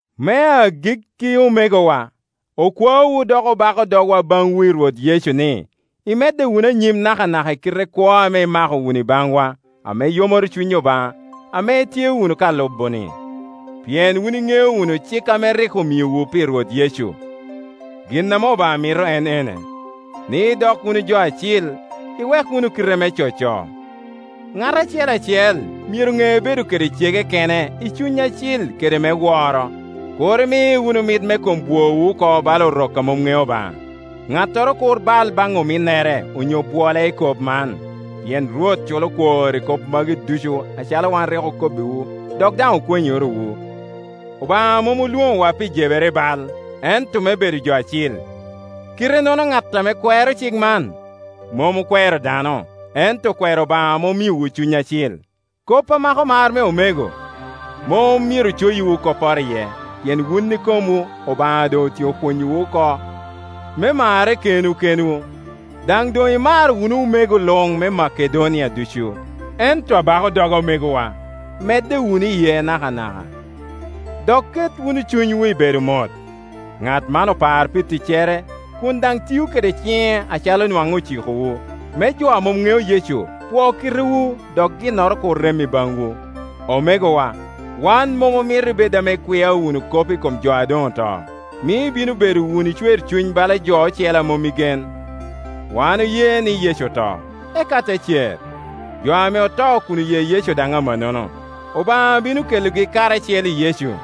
Me agikki omegowa, okwaowu dok obako dogwa baŋwu i Rwot Yecu ni, imedde wunu anyim nakanaka i kite kwo ame imako wunu i baŋwa, ame yomoro cuny Obaŋa, ame itye wunu ka lubo-ni. Pien wun iŋeo wunu cik ame rik omiowu pi Rwot Yecu. Gin ame Obaŋa mito en ene, ni idok wunu jo acil: iwek wunu kite me coco, ŋat acel acel myero ŋe bedo kede cege Onyo: loyo kome kene kene i cuny acil kede me woro. Kur imi wunu mit me kom bwowu oko bala Orok a mom ŋeo Obaŋa. Ŋattoro kur bal baŋ ominnere onyo bwole i kop man; pien Rwot culo kwor i kop magi ducu acalo wan rik okobbiwu dok daŋ okwenyorowu. Obaŋa mom olwoŋowa pi jebere i bal, ento me bedo jo acil. Kite-nono ŋat ame kwero cik man, mom okwero dano ento okwero Obaŋa ame omiowu Cuny Acil. Kop a mako mar me omego, mom myero coyiwu kopporo iye, pien wun ikomwu Obaŋa otyeko pwonyowu oko me marre kenwu kenwu, daŋ doŋ imaro wunu omego luŋ me Makedonia ducu. Ento abako doga omegowa, medde wunu iye nakanaka, dok ket wunu cunywu i bedo mot. Ŋat man opar pi ticcere, kun daŋ tio kede ciŋe acalo nwaŋ ocikowu, me jo ame mom ŋeo Yecu pwo kitewu dok ginnoro kur rem i baŋwu. Omegowa, wan mom omito ibed ame ikwia wunu kop i kom jo a doŋ oto, mio ibino wunu bedo i cwercuny bala jo ocele a mom i gen. Wan oye Yecu oto, eka te cer. Jo ame oto kun oye Yecu daŋ amannono, Obaŋa bino kelogi karacel i Yecu.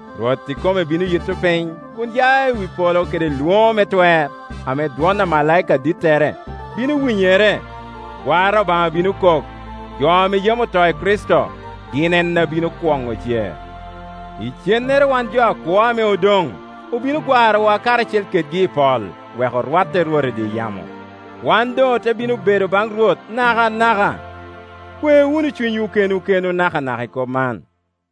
Rwot ikome bino yitto piny kun ya i wi polo kede lwoŋo me twer, ame dwon amalaika adittere bino winyere, gwara Obaŋa bino kok. Jo ame yam oto i Kricito gin en a bino kwoŋo cer, icennere wan jo akwo, ame odoŋ, obino gwarowa karacel kedgi i pol, wek orwatte i Rwot i dye yamo; wan doŋ ote bino bedo baŋ Rwot nakanaka. Kwe wunu cunywu kenwu kenwu nakanaka i kop man.